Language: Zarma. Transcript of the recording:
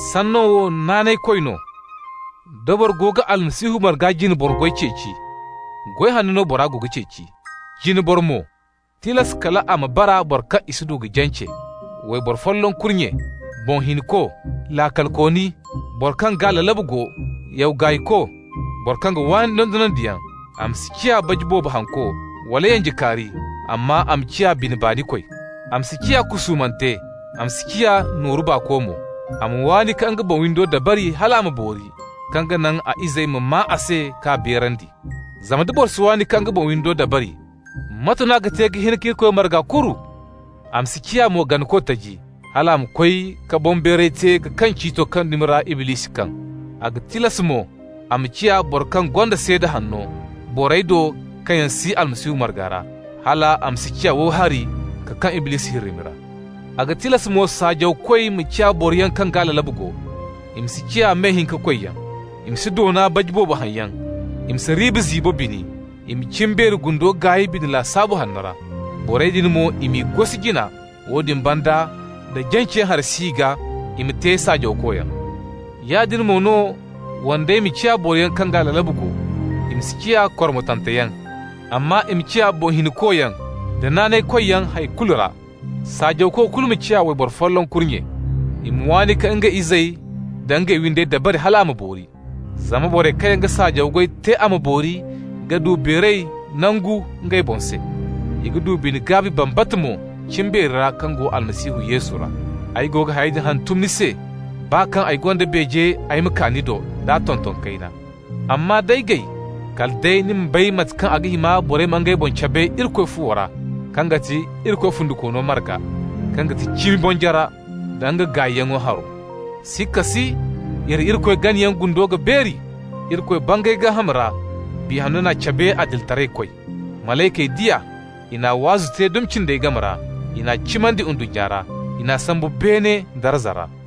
Sanno wo naanaykoy no: da boro go ga Almasihu marga jine boro goy ceeci, goy hanno no bora go ga ceeci. Jine boro mo, tilas kal a ma bara boro kaŋ i si du ka jance, wayboro folloŋ kurnye, boŋ hinko, laakalkooni, boro kaŋ gaa lalabu go, yaw gaayko, boro kaŋ ga waani dondonandiyaŋ. A ma si ciya baji boobo hanko, wala yanjekaari, amma a ma ciya bine baanikoy. A ma si ciya kusuumante, a ma si ciya nooru baako mo. A ma waani ka nga boŋ windo dabari hal a ma boori, kaŋ ga naŋ a izey ma maa a se k'a beerandi. Zama nda boro si waani ka nga boŋ windo dabari, mate no a ga te ka hin ka Irikoy marga kuru? A ma si ciya mo ganako taji, hal a ma koy ka boŋbeeray te ka kaŋ ciito kaŋ dumi ra Iblisi kaŋ. A ga tilas mo a ma ciya boro kaŋ gonda seeda hanno borey do kaŋ yaŋ si Almasihu marga ra, hal a ma si ciya wowi hari ka kaŋ Iblisi hirrimi ra. A ga tilas mo saajawkoy ma ciya boroyaŋ kaŋ gaa lalabu go. I ma si ciya me-hinka koyyaŋ. I ma si doona baji boobo haŋyaŋ, i ma si riiba ziibo bini. I ma cimbeeri gundo gaay bine lasaabu hanno ra. Borey din mo, i m'i gosi jina, woodin banda nda janceyaŋ hari si i gaa, i ma te saajawkoyaŋ. Yaadin mo no wandey ma ciya boroyaŋ kaŋ gaa lalabu go. I ma si ciya kormotanteyaŋ, amma i ma ciya boŋ hinkoyaŋ, da naanaykoyyaŋ hay kulu ra. Saajawko kulu mo ma ciya wayboro folloŋ kurnye. I ma waani ka ngey izey da ngey windey dabari hal a ma boori. Zama borey kaŋ yaŋ ga saajawko goy te a ma boori ga du beeray nangu ngey boŋ se. I ga du bine-gaabi bambata mo cimbeeri ra kaŋ go Almasihu Yesu ra. Ay go ga hayey din hantum ni se, baa kaŋ ay gonda beeje ay ma kaa ni do d'a tonton kayna. Amma d'ay gay, kala day ni ma bay mate kaŋ a ga hima borey ma ngey boŋ cabe Irikoy fuwo ra, kaŋ ga ti Irikoy fundikoono marga, kaŋ ga ti cimi bonjara da nga gaayyaŋ haro. Sikka si, iri Irikoy ganayaŋ gundo ga beeri: Irikoy bangay gaaham ra. Biya Hanno n'a cabe adilitaraykoy. Malaykey di a. I n'a waazo te dumi cindey game ra. I n'a cimandi ndunnya ra. I n'a sambu beene darza ra.